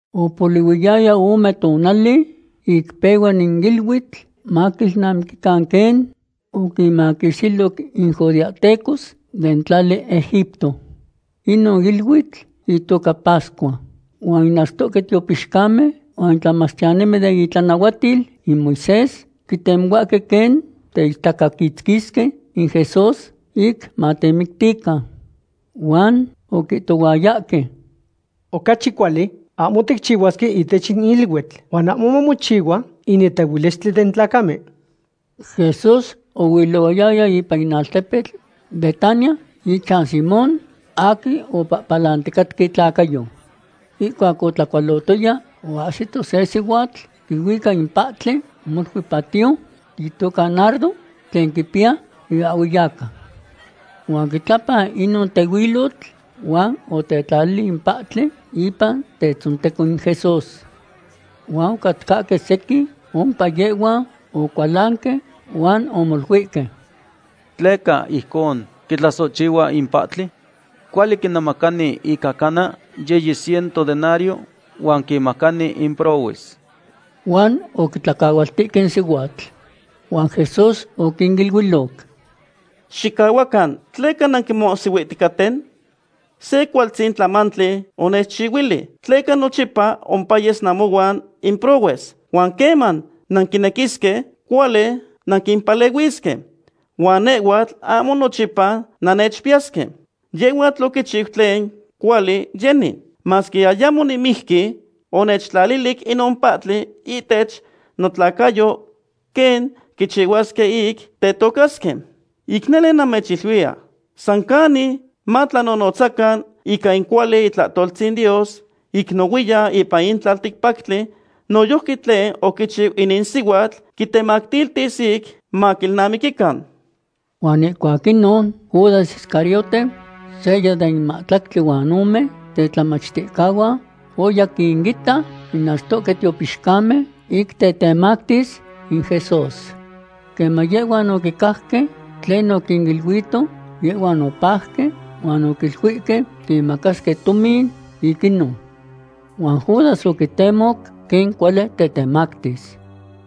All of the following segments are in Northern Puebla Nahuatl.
Opolihuiyaya ome tonali ic pehua in iluitl maquilnamiquican quen oquinmaquixtiloc in judeahtecos den tlali Egipto. Inon iluitl itoca pascua. Huan in achtohque tiopixcamen huan in tlamachtiyanimen den itlanahuatil in Moisés quitemohuahque quen teichtacaquitzquisque in Jesús ic matemictican. Huan oquihtohuayahque: ―Ocachi cuali ahmo ticchihuasque ihtech in iluitl, huan ahmo mamochihua in netehuilistli den tlacamen. Jesús oilohuaya ipan in altepetl Betania ichan Simón aquin opapalanticatca itlacayo. Ihcuac otlacualotoya, oahsito se sihuatl quihuica in pahtli molui patiyo itoca nardo, tlen quipiya iahhueyaca. Huan oquitlapan inon tehuilotl huan otetlalili in pahtli ipan tetzonteco in Jesús. Huan ocatcahque sequin ompa yehhuan ocualanque huan omoluihque: ―¿Tleca ijcon quitlasohchihua in pahtli? Cuali quinemacani ica cana yiyi ciento denario huan quinmacani in prohues. Huan oquitlacahualtihque in sihuatl. Huan Jesús oquiniluiloc: ―Xicahuacan. ¿Tleca nanquimohsihuihticaten? Se cualtzin tlamantli onechchihuili. Tleca nochipa ompayes namohuan in prohues, huan queman nanquinequisque, cuali nanquimpalehuisque. Huan nehhuatl ahmo nochipa nannechpiyasque. Yehhuatl oquichiu tlen cuali yeni. Masque ayamo nimijqui, onechtlalilic inon pahtli ihtech notlacayo quen quichihuasque ic tetocasque. Ic nele namechiluiya, san canic matlanonotzacan ica in cuali itlahtoltzin Dios ic nohuiyan ipan in tlalticpactli, noyojqui tlen oquichiu inin sihuatl quitematiltis ic maquilnamiquican. Huan ihcuac inon, Judas Iscariote, seya den mahtlactli huan ome tetlamachticahuan, oya quinita in achtohque tiopixcamen ic tetemactis in Jesús. Queman yehhuan oquicajque tlen oquiniluihto, yehhuan opajque huan oquiluihque quimacasque tomin ic inon. Huan Judas oquitemoc quen cuali tetemactis.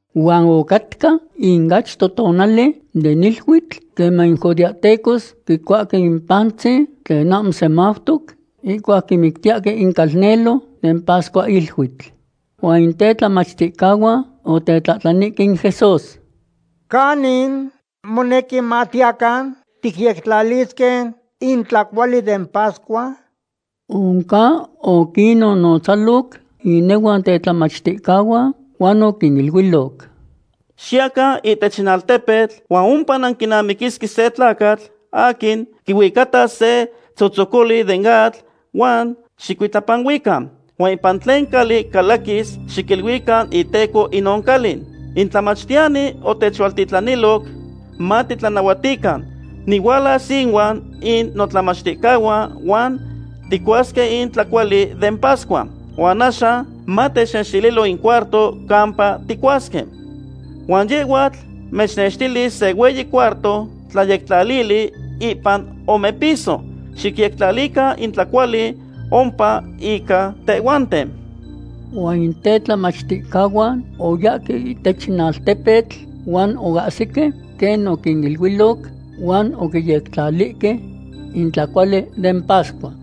Huan ocatca in achto tonali den iluitl queman in judeahtecos quicuahque in pantzin tlen ahmo semautoc, ihcuac quimictiyahque in calnelo den pascuahiluitl. Huan in tetlamachticahuan otetlahtlanihque in Jesús: ―¿Canin monequi matiyacan ticyectlalisque in tlacuali den pascua? Oncan oquinnotzaloc inehuan tetlamachticahuan huan oquiniluiloc: ―Xiyacan ihtech in altepetl huan ompa nanquinamiquisque se tlacatl aquin quihuicatas se tzotzocoli den atl huan xicuitlapanuican. Huan ipan tlen cali calaquis, xiquiluican iteco inon cali: “In tlamachtiyani otechualtitlaniloc matitlanahuatican: Nihualas ihuan in notlamachticahuan huan ticuasque in tlacuali den pascua. Huan axan matechnextililo in cuarto campa ticuasque.” Huan yehhuatl mechnextilis se hueyi cuarto tlayectlalili ipan omepiso. Xicyectlalican in tlacuali ompa ica tehhuanten. Huan in tetlamachticahuan oyahque ihtech in altepetl huan ocahsique quen oquiniluiloc, huan oquiyectlalihque in tlacuali den pascua.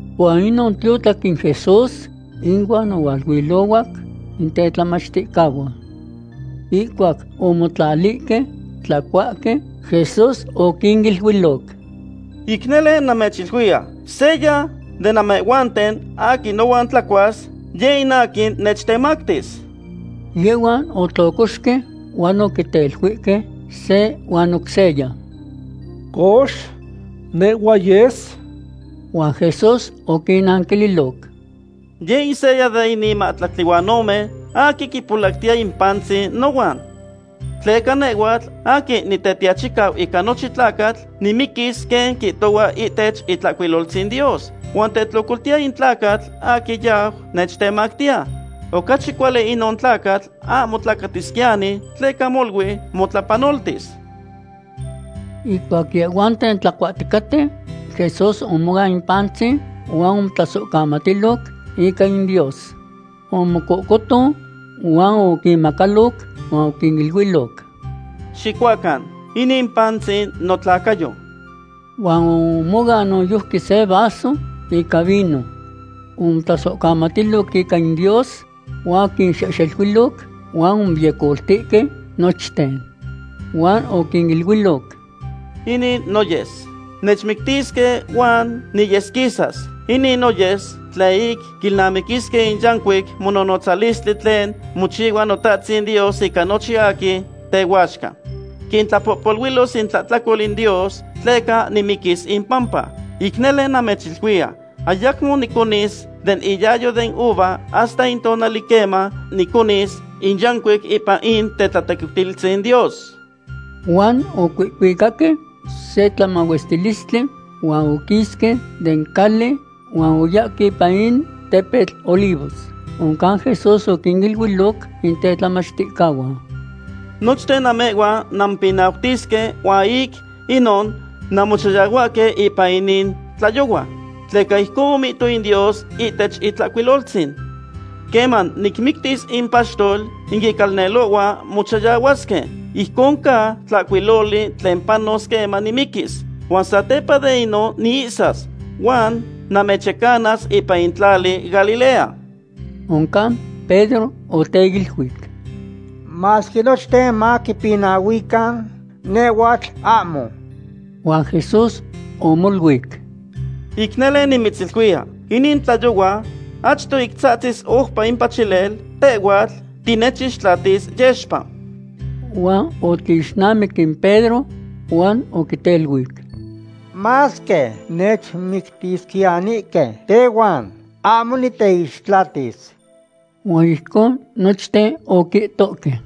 Huan inon tiotlac in Jesús inuan ohualuilohuac in tetlamachticahuan. Ihcuac omotlalihque tlacuahque, Jesús oquiniluiloc: ―Ic nele namechiluiya, seya de namehhuanten aquin nohuan tlacuas, yeh in aquin nechtemactis. Yehhuan otlocoxque huan oquiteluihque se huan oc seya: ―Cox, ¿nehhua yes? Huan Jesús oquinnanquililoc: ―Yeh in seya de inin mahtlactli huan ome aquin quipolactiya in pantzin nohuan. Tleca nehhuatl aquin Nitetiachicau ica nochin tlacatl nimiquis quen quihtohua ihtech Itlahcuiloltzin Dios, huan tetlocoltiya in tlacatl aquin yau nechtemactiya. Ocachi cuali inon tlacatl ahmo tlacatisquiyani tleca molui motlapanoltis. Ihcuac yehhuanten tlacuahticaten, Jesús omoan in pantzin huan omotlasohcamatiloc ica in Dios. Omocohcoton huan oquinmahmacaloc huan oquiniluiloc: ―Xicuacan, inin pantzin notlacayo. Huan omoan noyojqui se vaso ica vino. Omotlasohcamatiloc ica in Dios, huan oquinxehxeluiloc huan omoyecoltihque nochten. Huan oquiniluiloc: ―Inin noyes. Nechmictisque huan niyesquisas. Inin noyes tlen ic quilnamiquisque in yancuic mononotzalistli tlen mochihua Notahtzin Dios ica nochin aquin tehuaxca. Quintlapohpoluilos intlahtlacol in Dios tleca nimiquis impampa. Ic nele namechiluiya, ayacmo niconis den iyayo den uva hasta in tonali queman niconis in yancuic ipan in tetlatequiutilistzin Dios. Huan ocuihcuicaque se tlamahuestilistli huan oquisque den cali huan oyahque ipan in tepetl Olivos. Oncan Jesús oquiniluiloc in tetlamachticahuan: ―Nochten namehhuan nanmopinautisque huan ic inon nanmochayahuahque ipan inin tlayohua. Tleca ijcon omihto in Dios ihtech Itlahcuiloltzin: “Queman nicmictis in paxtol, in icalnelohuan mochayahuasque.” Ijcon ca tlahcuiloli tlen panos queman nimiquis. Huan satepa de inon niihsas, huan namechyecanas ipan in tlali Galilea. Oncan Pedro oteiluic: ―Masque nochten mapinahuican, nehhuatl ahmo. Huan Jesús omoluic: ―Ic nele nimitziluiya, inin tlayohua achto ic tzahtzis oupa in pachilel, tehhuatl tinechixtlatis yexpa. Huan otlixnamic in Pedro huan oquiteluic: ―Masque nechmictisquiyanihque tehuan, ahmo niteixtlatis. Huan ijcon nochten oquihtohque.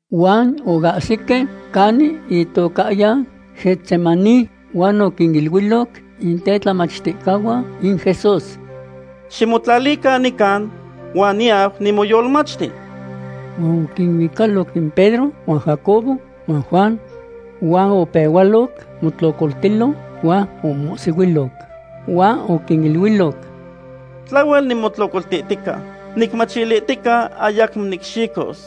Huan oahsique canin itocahyan Getsemaní huan oquiniluiloc in tetlamachticahuan in Jesús: ―Ximotlalican nican huan niyau nimoyolmachti. Huan oquinuicaloc in Pedro huan Jacobo huan Juan. Huan opehualoc motlocoltilo, huan omomohsihuiloc. Huan oquiniluiloc: ―Tlahuel nimotlocoltihtica nicmachilihtica ayacmo nicxicos.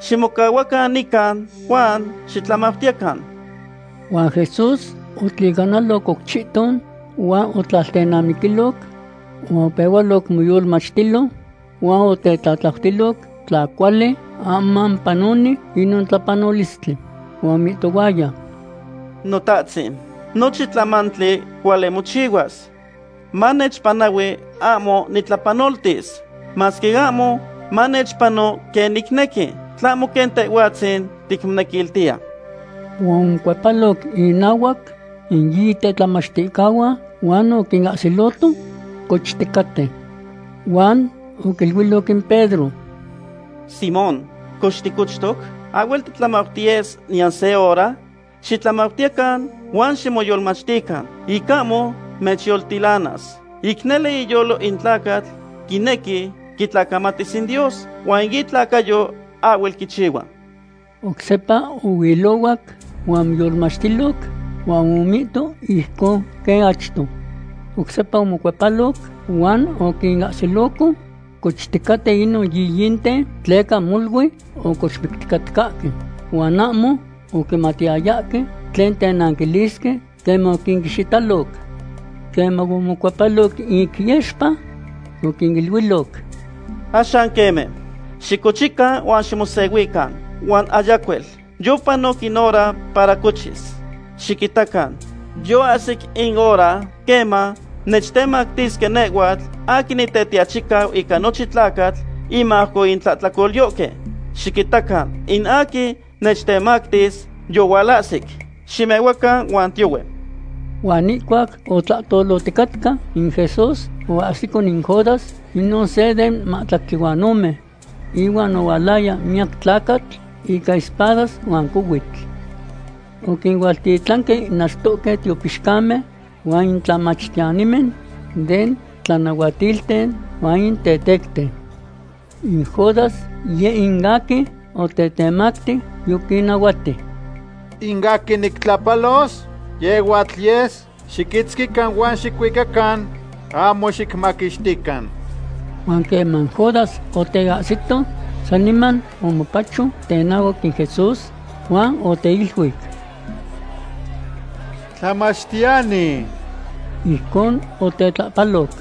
Ximocahuacan nican huan xitlamautiyecan. Huan Jesús otlicanaloc oc chihton, huan otlaltenamiquiloc huan opehualoc moyolmachtilo huan otetlatlautiloc tla cuali, ahmo mopanoni inon tlapanolistli. Huan omihtohuaya: ―Notahtzin, nochin tlamantli cuali mochihuas. Manechpanahui ahmo nictlapanoltis. Masque ahmo manechpano quen nicnequi, tlahmo quen Tehhuatzin ticmonequiltiya. Huan omocuepaloc inahuac in yiyi tetlamachticahuan huan oquinahsiloto cochticaten. Huan oquiluiloc in Pedro: ―Simón, cox, ¿ticochtoc? ¿Ahhuel titlamautiyes niyan se hora? Xitlamautiyecan huan ximoyolmachtican, ic ahmo mechyoltilanas. Ic nele iyolo in tlacatl quinequi quitlacamatis in Dios huan in itlacayo ahhuel quichihua. Oc sepa ohuilohuac huan omoyolmachtiloc, huan omihto ijcon quen achto. Oc sepa omocuepaloc huan oquinahsiloco cochticaten inon yiyinten, tleca molui ocochmicticatcahque, huan ahmo oquimatiyayahque tlen tenanquilisque queman oquinihxitiloc. Queman omocuepaloc ic yexpa, oquiniluiloc: ―Axan queme, xicochican huan ximosehuican, huan ayacuel; yopanoc in hora para cochis. Xiquitacan, yoahsic in hora queman nechtemactisque nehhuatl aquin Nitetiachicau ica nochin tlacatl inmajco in tlahtlacolyohque. Xiquitacan in aquin nechtemactis yohualahsic. Ximehuacan huan tiyohue. Huan ihcuac otlahtoloticatca in Jesús, oahsico in Judas, inon se den mahtlactli huan ome. Ihuan ohualaya miyac tlacatl ica espadas huan cohuitl. Oquinualtitlanque in achtohque tiopixcamen huan in tlamachtiyanimen den tlanahuatilten huan in tetecten. In Judas, yeh in aquin otetemacti, yoquinnahuati: ―In aquin nictlahpalos, yehhuatl yes. Xiquitzquican huan xicuicacan ahmo xicmaquixtican. Huan queman Judas oteahsito, saniman omopacho tenahuac in Jesús huan oteiluic: ―¡Tlamachtiyani! Ijcon otetlahpaloc.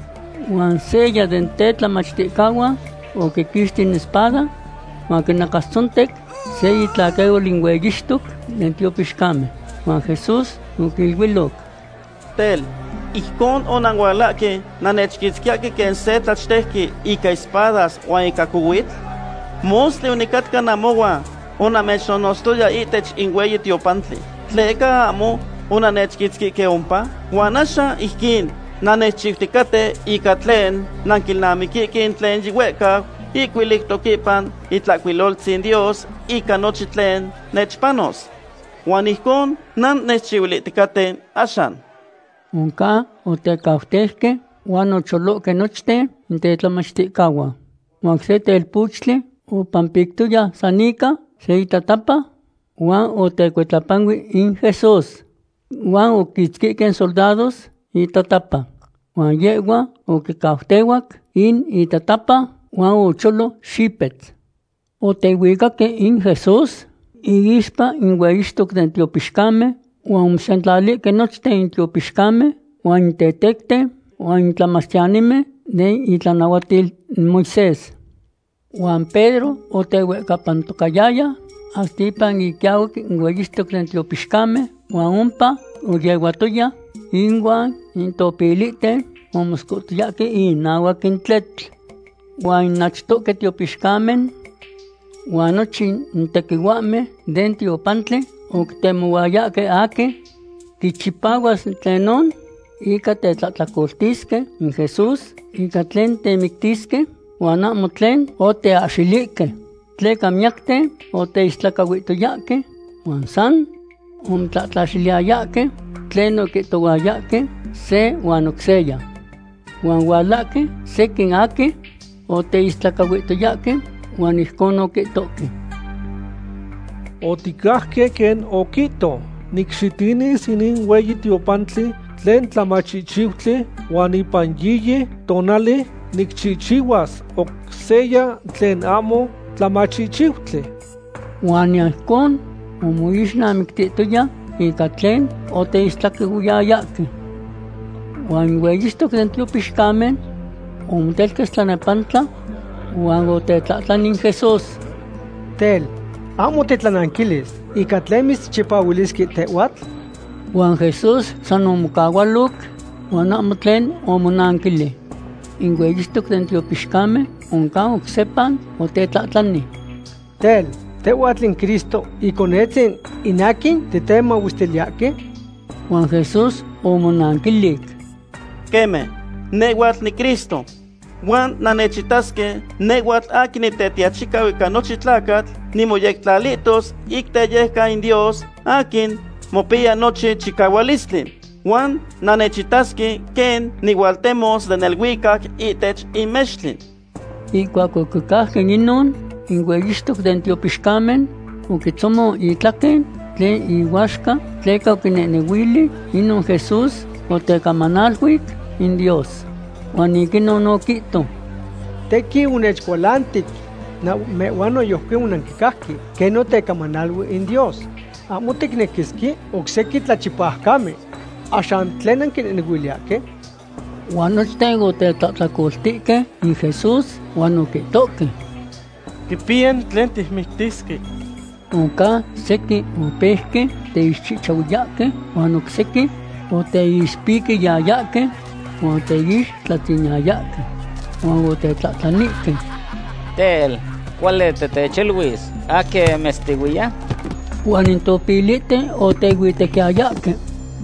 Huan seya den tetlamachticahuan oquiquixti in espada huan oquinacastzontec se itlaquehual in hueyixtoc den tiopixcamen. Huan Jesús oquiniluiloc: ―Tel, ¿ijcon onanualahque nannechquitzquiyahque quen se tlachtejqui ica espadas huan ica cohuitl? Mostli onicatca namohuan onamechnonotztoya ihtech in hueyi tiopantli. ¿Tleca ahmo onannechquitzquihque ompa? Huan axan ijquin nannechchiuticaten ica tlen nanquilnamiquihque in tlen yihuehcau ihcuiliutoc ipan Itlahcuiloltzin Dios ica nochin tlen nechpanos. Huan ijcon nannechchihuilihticaten axan. Oncan otecautejque huan ocholohque nochten in tetlamachticahuan. Huan se telpochtli opanpictoya san ica se itatapa huan otecuitlapanui in Jesús. Huan oquiquitzquihque in soldados itatapa. Huan yehhua oquicautehuac in itatapa huan ocholo xipetz. Otehuicaque in Jesús iixpa in hueyixtoc den tiopixcamen huan omosentlalihque nochten in tiopixcamen huan in tetecten huan in tlamachtiyanimen den itlanahuatil in Moisés. Huan Pedro otehuehcapantocayaya hasta ipan iquiahuac in hueyixtoc den tiopixcamen huan ompa oyehuatoya inuan in topilten omoscohtoyahque inahuac in tletl. Huan in achtohque tiopixcamen huan nochin tequihuahmen den tiopantli oquitemohuayahque aquin quichipahuas tlenon ica tetlahtlacoltisque in Jesús ica tlen temictisque, huan ahmo tlen oteahxilihque. Tleca miyacten oteistlacahuihtoyahque huan san omotlatlaxiliyayahque tlen oquihtohuayahque se huan oc seya. Huan ohualahque sequin aquin oteistlacahuihtoyahque huan ijcon oquihtohque: ―Oticajque quen oquihto: “Nicxitinis inin hueyi tiopantli tlen tlamachihchiutli huan ipan yiyi tonali nicchihchihuas oc seya tlen ahmo tlamachihchiutli.” Huan niyan ijcon omoixnamictitoya ica tlen oteistlacahuiyayahque. Huan in hueyixtoc den tiopixcamen omotelquetz tlanepantla huan otetlahtlani in Jesús: ―Tel, ¿ahmo titlananquilis ica tlen mitzchipahuilisque tehhuatl? Huan Jesús san omocahualoc huan ahmo tlen omonanquilic. In hueyixtoc den tiopixcamen oncan oc sepa otetlahtlani: ―Tel, ¿tehhuatl in Cristo, Iconetzin in aquin titemahuestiliyahque? Huan Jesús omonanquilic: ―Queme, nehhuatl niCristo. Huan nannechitasque nehhuatl aquin Nitetiachicau ica nochin tlacatl nimoyectlalihtos ic teyejcan in Dios aquin mopiya nochin chicahualistli. Huan nannechitasque quen nihualtemos den neluicac ihtech in mextli. Ihcuac oquicajque inon, in hueyixtoc den tiopixcamen oquitzomon itlaquen tlen ihuaxca tleca oquinehnehuili inon Jesús otecamanaluic in Dios. Huan ic inon oquihto: ―Tequin onechcualantic. Namehhuan noyojqui onanquicajque quen otecamanaluic in Dios. Ahmo ticnequisque oc sequin tlachipaucamen. ¿Axan tlen nanquinehnehuiliyahque? Huan nochten otetlahtlacoltihque in Jesús huan oquihtohque: ―Quipiya tlen ticmictisque. Oncan sequin opeuque teixchihchahuiyahque, huan oc sequin oteixpiquiyayahque huan oteixtlatziniyayahque. Huan otetlahtlanihque: ―Tel, ¿cuali titechiluis aquin mitztehuiya? Huan in topilihten otehuihhuitequiyayahque.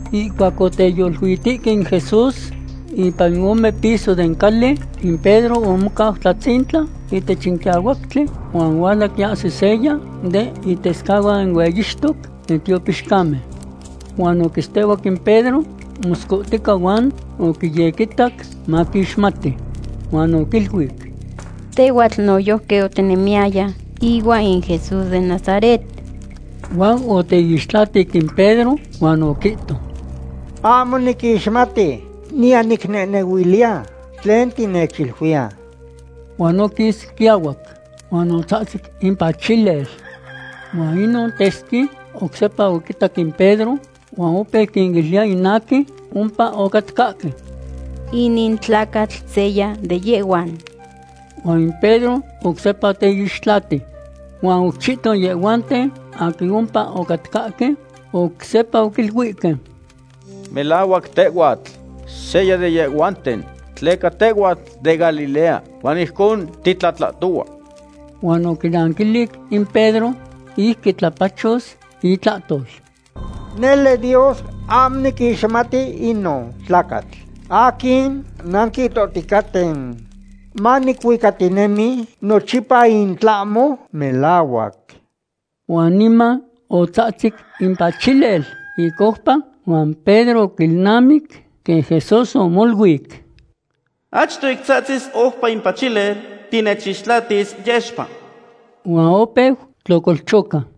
Ihcuac oteyoluihtihque in Jesús ipan in ome piso den cali, in Pedro omocau tlatzintla ihtech in quiahuactli, huan ohuala quiahsi seya den itescahuan in hueyixtoc den tiopixcamen. Huan oquitztehuac in Pedro moscohtica huan oquiyequitac maquixmati. Huan oquiluic: ―Tehhuatl noyojqui otinemiyaya ihuan in Jesús den Nazaret. Huan oteixtlatic in Pedro, huan oquihto: ―Ahmo niquixmati, niyan nicnehnehuiliya tlen tinechiluiya. Huan oquis quiahuac. Huan otzahtzic in pachilel. Huan inon tesqui oc sepa oquitac in Pedro huan opeu quiniluiya in aquin ompa ocatcahque: ―Inin tlacatl seya de yehhuan. Huan Pedro oc sepa oteixtlatic. Huan oc chihton yehhuanten aquin ompa ocatcahque oc sepa oquiluihque: ―Melahuac tehhuatl seya de yehhuanten, tleca tehhuatl de Galilea huan ijcon titlahtohua. Huan oquinanquilic in Pedro ic quitlapachos itlahtol: ―Nele Dios ahmo niquixmati inon tlacatl aquin nanquihtohticaten. Manicuicatinemi nochipa in tlahmo melahuac. Huan niman otzahtzic in pachilel ic oupa huan Pedro oquilnamic quen Jesús omoluic: “Achto ic tzahtzis oupa in pachilel tinechixtlatis yexpa.” Huan opeu tlocolchoca.